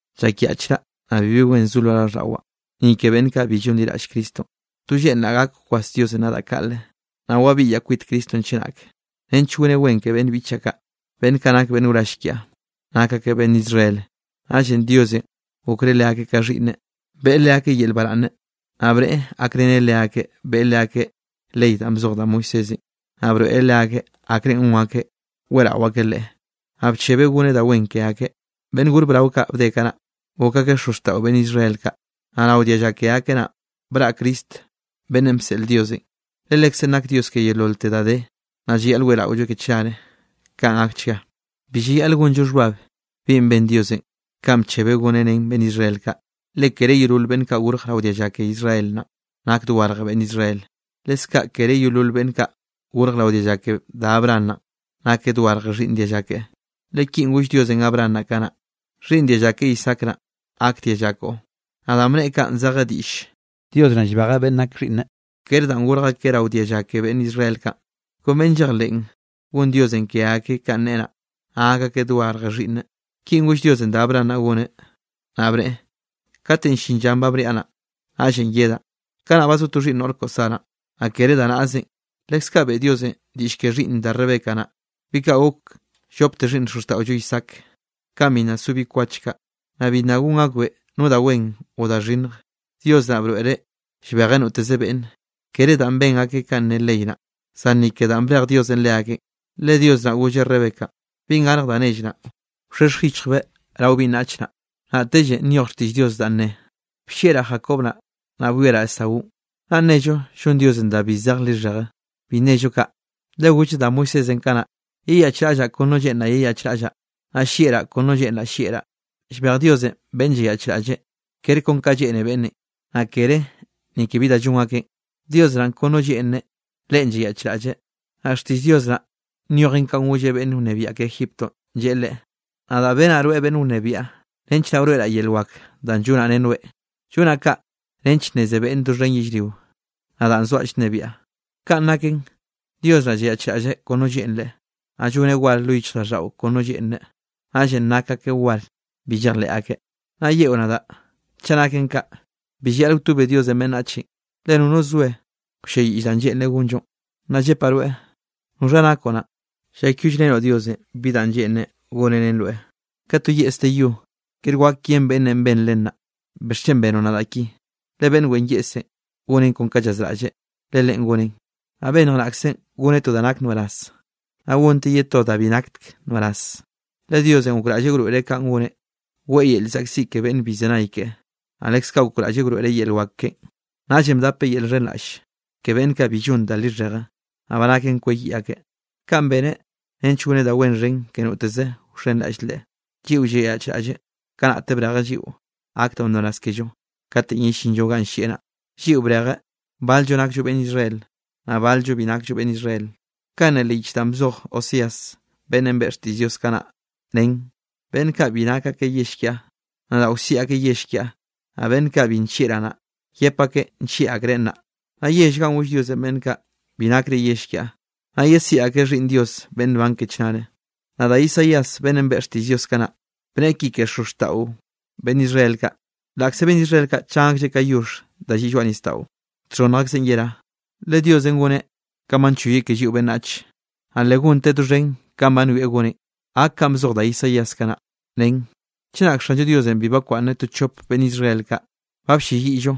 Llakyaꞌchraꞌ, naꞌ bibi wen zo lo raꞌlldaꞌwaꞌ, ni ke beꞌnn kaꞌ bi llonliraꞌll Cristonꞌ. To lleꞌnraꞌ gak kwas Diosenꞌ nadaꞌ kaꞌle, naꞌ wabiꞌyaꞌ kwit Cristonꞌ chenak, nench goneꞌ wen ke beꞌnn biꞌchaꞌ kaꞌ, beꞌnn kaꞌ nak beꞌnn wrall kiaꞌ. Nak akeꞌ beꞌnn Israel, naꞌllenꞌ Diosenꞌ gokreꞌ leakeꞌ ka xhiꞌnneꞌ, beꞌe leakeꞌ yel baraꞌnne, naꞌ bneꞌe gakreneꞌ leakeꞌ, beꞌe leakeꞌ ley danꞌ bzoj da Moisésenꞌ, naꞌ broeꞌreꞌ leakeꞌ akrenꞌ gon akeꞌ weꞌrao akeꞌ Leꞌe, naꞌ bchebeꞌ goneꞌ da wen ke akeꞌ. Beꞌnn gor brao kaꞌ bde kanaꞌ, gok akeꞌ xozxtaꞌo beꞌnn Israel kaꞌ. Naꞌ rao dialla ke akeꞌ naꞌn, braꞌ Cristo beꞌnnenꞌ bseꞌl Diosenꞌ. Le Lekzeꞌn nak Dios ke yeololte da de, naꞌ llayaꞌl weꞌraolloeꞌ ke chnare. Kaꞌn gakchga. Bi llayaꞌl gonllo xhbab bi ben Diosenꞌ kanꞌ bchebeꞌ goneꞌ ren beꞌnn Israel kaꞌ. Le kere yeolol beꞌnn kaꞌ gorj rao dialla ke Israel naꞌn nak dogarj beꞌnn Israel. Leskaꞌ kere yeolol beꞌnn kaꞌ gorje rao dialla ke da Abraham naꞌn nake dogarje xhiꞌnn dialla keꞌe, le kinꞌ goll Diosenꞌ Abraham naꞌ kanaꞌ: “Xhiꞌnn dialla ke Isaac naꞌ, gak dialla koꞌon.” Naꞌ danꞌ bneꞌe kaꞌn zeje diꞌll Dios naꞌn llbejeꞌ beꞌnn nak xhiꞌnneꞌ kere danꞌ gorj akeꞌ rao dialla ke beꞌnn Israel kaꞌn, kon beꞌnn llejleꞌn, gon Diosenꞌ ke akeꞌ kanꞌ neꞌe naꞌ, naꞌ gak akeꞌ dogarje xhiꞌnneꞌ. Kinꞌ goll Diosenꞌ da Abraham naꞌ goneꞌ, naꞌ bneꞌe: “Katenꞌ llin llanꞌ ba bniaꞌ naꞌ, naꞌllenꞌ yedaꞌ, kanaꞌ ba zo to xhiꞌnn noꞌr koꞌo Saranꞌ.” Naꞌ kere da naꞌzenꞌ, leskaꞌ beꞌe Diosenꞌ diꞌll ke xhiꞌnn da Rebeca naꞌ, bi kaꞌ gok llopte xhiꞌnn xozxtaꞌollo Isaac. Kanꞌ bi nna so bi kwach kaꞌ, naꞌ bibi nna gon akbeꞌ no da wen o da xhinnj, Dios naꞌ broeꞌreꞌ llbejeꞌ noteze beꞌnne, kere danꞌ ben akeꞌ ka ne ley naꞌ, zan ni ke danꞌ brej Diosenꞌ leakeꞌn. Le Dios naꞌ golleꞌ Rebecanꞌ: “Binꞌ garje da nell naꞌ, wxhexj yichjbeꞌ rao binꞌ naꞌch naꞌ.” Naꞌtelle nyoj xtiꞌll Dios danꞌ ne: “Bllieꞌraꞌ Jacob naꞌ, naꞌ bwieraꞌ Esaúnꞌ.” ¿Naꞌ nnello llon Diosenꞌ da bi zej lixheje? ¡Bi nnello kaꞌ! Le golleꞌ da Moisésenꞌ kanaꞌ: “Yeyaꞌchraꞌllaꞌ kon no lleꞌnraꞌ yeyaꞌchraꞌllaꞌ. Naꞌ llieꞌraꞌ kon no lleꞌnraꞌ llieꞌraꞌ.” Llbej Diosenꞌ beꞌnn llayaꞌchraꞌlleꞌ, kere kon kanꞌ lleꞌne beꞌnnenꞌ, naꞌ kere ni ke bi da llon akeꞌn. Dios naꞌn kon no lleꞌnreꞌ, leꞌen llayaꞌchraꞌlleꞌ. Naꞌ xtiꞌll Dios naꞌ nyojen kanꞌ golleꞌ beꞌnn wnebiaꞌ ke Egiptonꞌ, lleꞌe leꞌe: “Nadaꞌ benaꞌ rweꞌ beꞌnn wnebiaꞌ, nench naꞌ wroeꞌraꞌ yel wak danꞌ llonaꞌ ren rweꞌ. Llonaꞌ kaꞌ nench nneze beꞌnne doxhen yellrio, nadaꞌn zoaꞌ llnebiaꞌ.” Kaꞌn naken Dios naꞌ llayaꞌchraꞌlleꞌ kon no lleꞌnreꞌ, naꞌ lloneꞌ war lo yichjraꞌlldaꞌo kon no lleꞌnreꞌ, naꞌllenꞌ nak akeꞌ war bi llejleꞌ akeꞌ. Naꞌ yeꞌo nadaꞌ: “Chaꞌ kaꞌ naken, bi llayaꞌl wtobe Diosenꞌ beꞌnnachenꞌ, le nono soe wlleyiꞌlleꞌ danꞌ lleꞌnreꞌ gonllonꞌ.” Naꞌ llepaꞌ rweꞌ, ¿noxha nakoꞌ naꞌn, llakyollrenoꞌ Diosenꞌ bi danꞌ lleꞌnreꞌ goneꞌ ren rweꞌ? Ka to yeꞌs de yo, kere wak yen beꞌnnenꞌ ben len naꞌ: “¿Bixchen benoꞌ nadaꞌ ki?” Le beꞌnn wen yeꞌsenꞌ goneꞌn kon ka llazraꞌlleꞌ, le leꞌen goneꞌn. Naꞌ bennj naꞌkzenꞌ goneꞌ to da nak nbaraz, naꞌ gonteꞌ ye to da bi nakteke nbaraz. Le Diosenꞌ gokraꞌlleꞌ wroeꞌreꞌ ka goneꞌ, weꞌe yel llzaꞌkziꞌ ke beꞌnn bi llzenay keꞌe, naꞌ leskaꞌ gokraꞌlleꞌ wroeꞌreꞌ yel wak keꞌen. Naꞌllenꞌ bdapeꞌ yel xhenraꞌlle ke beꞌnn kaꞌ bi llon da lixheje, naꞌ ba naken kweyiꞌ akeꞌ. Kaꞌn beneꞌ nench goneꞌ da wen xhen ke noteze wxenraꞌll Leꞌe, lliꞌo llayaꞌchraꞌlleꞌ. Kanaꞌte brejeꞌ lliꞌo gak da nbaraz kello katenꞌ yellinllo ganꞌ llieꞌ naꞌ. Lliꞌo brejeꞌ, bal-llo nakllo beꞌnn Israel, naꞌ bal-llo bi nakllo beꞌnn Israel. Kaꞌn ne leꞌ yich danꞌ bzoj Oseas, beꞌnnenꞌ beꞌe xtiꞌll Dios kanaꞌ nen: Beꞌnn kaꞌ bi nake yell kiaꞌ, nadaꞌ wsiꞌi akeꞌ yell kiaꞌ, naꞌ beꞌnn kaꞌ bi bllieꞌraꞌ naꞌ, yep akeꞌ nllieꞌ akreꞌ nnaꞌ. Naꞌ yell ganꞌ goll Diosenꞌ beꞌnn kaꞌ: “Bi nakre yell kiaꞌ”, naꞌ yeziꞌi akeꞌ xhiꞌnn Dios beꞌnn nban ke chnare. Naꞌ da Isaías beꞌnnenꞌ beꞌe xtiꞌll Diosenꞌ kanaꞌ, bneꞌe ki ke xozxtaꞌo beꞌnn Israel kaꞌ: “Laꞌkze beꞌnn Israel kaꞌ chan aklleꞌ ka yoxh da lliꞌ lloaꞌ nisdaꞌo, txhonnj akzeꞌn yerá. Le Diosenꞌ goneꞌ kanꞌ ba nchoyeꞌ ke lliꞌo beꞌnnach, naꞌ le gonteꞌ doxhen kanꞌ ba nwieꞌ goneꞌn.” Gak kanꞌ bzoj da Isaíasenꞌ kanaꞌ, nen: Chenak Xanllo Diosenꞌ bi bakwaꞌnneꞌ to chope beꞌnn Israel kaꞌ, ba blleyiꞌllo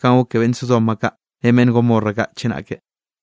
kanꞌ gok ke beꞌnn Sodoma kaꞌ ren beꞌnn Gomorra kaꞌ chenake.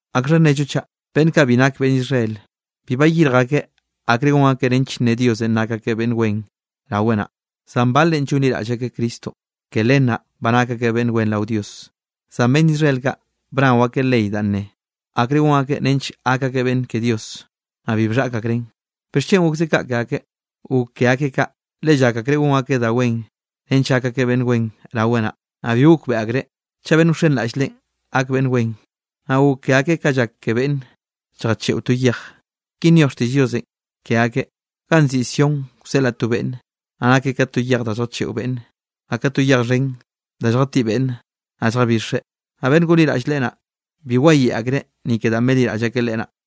¿Akxha nnello chaꞌ? Beꞌnn kaꞌ bi nake beꞌnn Israel, bi bayirj akeꞌ akre gon akeꞌ nench nne Diosenꞌ nak akeꞌ beꞌnn wen raweꞌ naꞌ, zan baleꞌ llonliraꞌll akeꞌ Cristonꞌ, ke len naꞌ ba nak akeꞌ beꞌnn wen rao Dios. Zan beꞌnn Israel kaꞌ bnao akeꞌ ley danꞌ ne, akrenꞌ gon akeꞌ nench gak akeꞌ beꞌnn ke Dios, naꞌ bi bxhaꞌk akreꞌn. ¿Bixchen gokze kaꞌ ke akeꞌ? Gok ke akeꞌ kaꞌ, le llak akreꞌ gon akeꞌ da wen nench gak akeꞌ beꞌnn wen raweꞌ naꞌ, naꞌ bi gokbeꞌe akreꞌ chaꞌ beꞌnn wxenraꞌll Leꞌen gak beꞌnn wen. Naꞌ gok ke akeꞌ ka llak ke beꞌnn lljacheꞌo to yej. Ki nyoj xtiꞌll Diosenꞌ ke akeꞌ: Ganꞌ nziꞌi Sión wseꞌlaꞌ to beꞌnne, naꞌ nakeꞌ ka to yej da lljacheꞌo beꞌnne, naꞌ ka to yej xhen da lljatiꞌ beꞌnne, naꞌ lljabixeꞌ. Naꞌ beꞌnn gonliraꞌll Leꞌe naꞌ, bi wayeꞌe akreꞌ ni ke danꞌ benliraꞌll akeꞌ Leꞌe naꞌ.